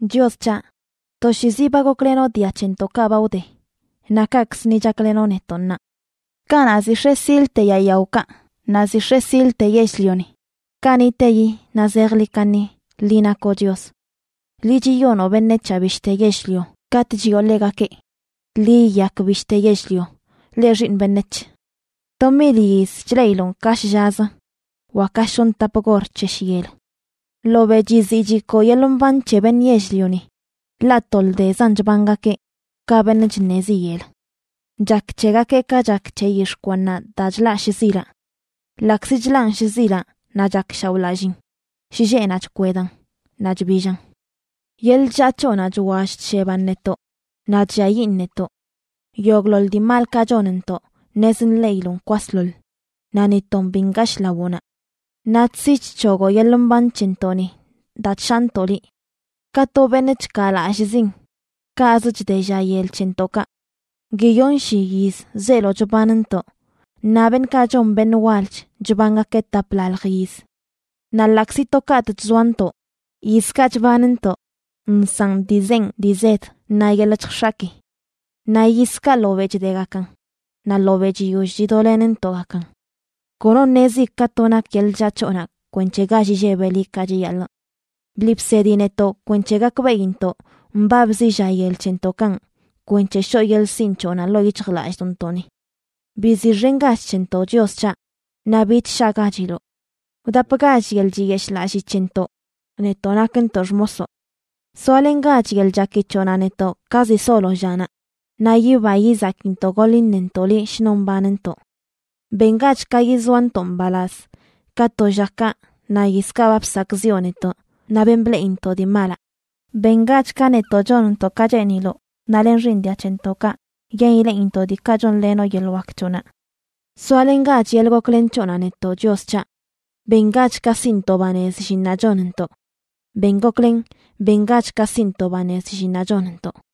Chios c̱haꞌ, toshiizi ba goklenoꞌ dia c̱hentoꞌkaꞌ ba wde, naꞌ kaꞌkzə ni chaklenoꞌ netoꞌ ṉaa. Kanaꞌ ziꞌ x̱e silte yaa yaokaꞌ naꞌ ziꞌ x̱e silte yell-lioni, kaniꞌteyi naꞌ zejḻi kaṉi, liꞌ nakoꞌ Chios. Liꞌ chiyonoꞌ beṉec̱haꞌ bishte yell-lio katꞌ chiꞌo ḻegakeꞌ: “Ḻi yiyak bishte yell-lio, leꞌ xiiṉ beṉec̱h.” To mil yiz chleꞌiloꞌn ka shllazə, wa ka shoṉ tap gor c̱he shyel. Ḻobeꞌ chiziꞌ chikoo yeḻꞌ mban c̱he beṉꞌ yell-lioni, ḻaꞌ to ldezan chbangakeꞌ, ka beṉꞌ chṉezi yel. Chak c̱hegakeꞌ ka chak c̱he yix̱ꞌ kwannaꞌ daa chlaꞌ shzilaꞌ. Ḻaꞌkzi chlaꞌn shzilaꞌ naꞌ chakshaoꞌlalliin, shlleꞌnaꞌ chkwedan naꞌ chbillan. Yeḻꞌ chllaa c̱hoꞌnaꞌ chwall chsheban netoꞌ naꞌ chlliayiꞌn netoꞌ. Yogꞌḻoḻ dii malkaꞌ chonntoꞌ ṉez nḻeꞌiloꞌn kwasḻoḻ, naꞌ ni ton bi ngashꞌ lawoꞌnaꞌ. Naꞌ chsi chc̱hogoꞌ yeḻꞌ mban c̱hentoꞌni daa chshaantoꞌ liꞌ. Ka to beṉꞌ chkaalallꞌzin, kaꞌzə chde lla yel c̱hentoꞌkaꞌ. Guiyonshi yiz zeelo chbanntoꞌ, naꞌ beṉꞌkaꞌ chon beṉꞌ walch chbangakeꞌ taplalj yiz. Naꞌ ḻaꞌkzi to katꞌ chzoantoꞌ, yizkaꞌ chbanntoꞌ nsaꞌn dii zenꞌ dii zed naꞌ yeḻꞌ chjx̱aki. Naꞌ yizkaꞌ ḻobeꞌ chdegakan, naꞌ ḻobeꞌ chiyoll chidolenntoꞌgakan. Kono ṉezi ka to nak yeḻꞌ chllaa c̱hoꞌnaꞌ kwenc̱he gall illebeꞌ liꞌ ka chiyaḻꞌ. Bliꞌ bsedi netoꞌ kwenc̱he gakbeꞌintoꞌ mbabzi lla yel c̱hentoꞌkanꞌ kwenc̱he shoꞌ yeḻꞌ sinꞌ c̱hoꞌnaꞌ ḻoo yic̱hjlallꞌdoꞌntoꞌni. Biziꞌxengach c̱hentoꞌ, Chios c̱haꞌ, naꞌ bich shaꞌgachiloꞌ. Wdapgach yeḻꞌ chiyeshꞌlallii c̱hentoꞌ, netoꞌ nakntoꞌ xmosoꞌ. Soalengach yeḻꞌ chaki c̱hoꞌnaꞌ netoꞌ ka ziꞌ solo llanaꞌ, naꞌ yiba yizakintoꞌ goḻ iṉentoꞌ liꞌ shnon mbanntoꞌ. Bengach ka yizoantoꞌ mbalaz, ka to llakaꞌ naꞌ yizkaꞌ ba bsakꞌziꞌo netoꞌ naꞌ ben bleꞌintoꞌ dii malaꞌ. Bengach ka netoꞌ chonntoꞌ ka cheeniloꞌ, naꞌ len xiiṉ dia c̱hentoꞌkaꞌ, yen ileꞌintoꞌ diikaꞌ chonlenoꞌ yeḻꞌ wak c̱hoꞌnaꞌ. Soalengach yeḻꞌ goklen c̱hoꞌnaꞌ netoꞌ, Chios c̱haꞌ. Bengach ka siꞌntoꞌ banez llinnaꞌ chonntoꞌ. Ben goklen, bengach ka siꞌntoꞌ banez llinnaꞌ chonntoꞌ.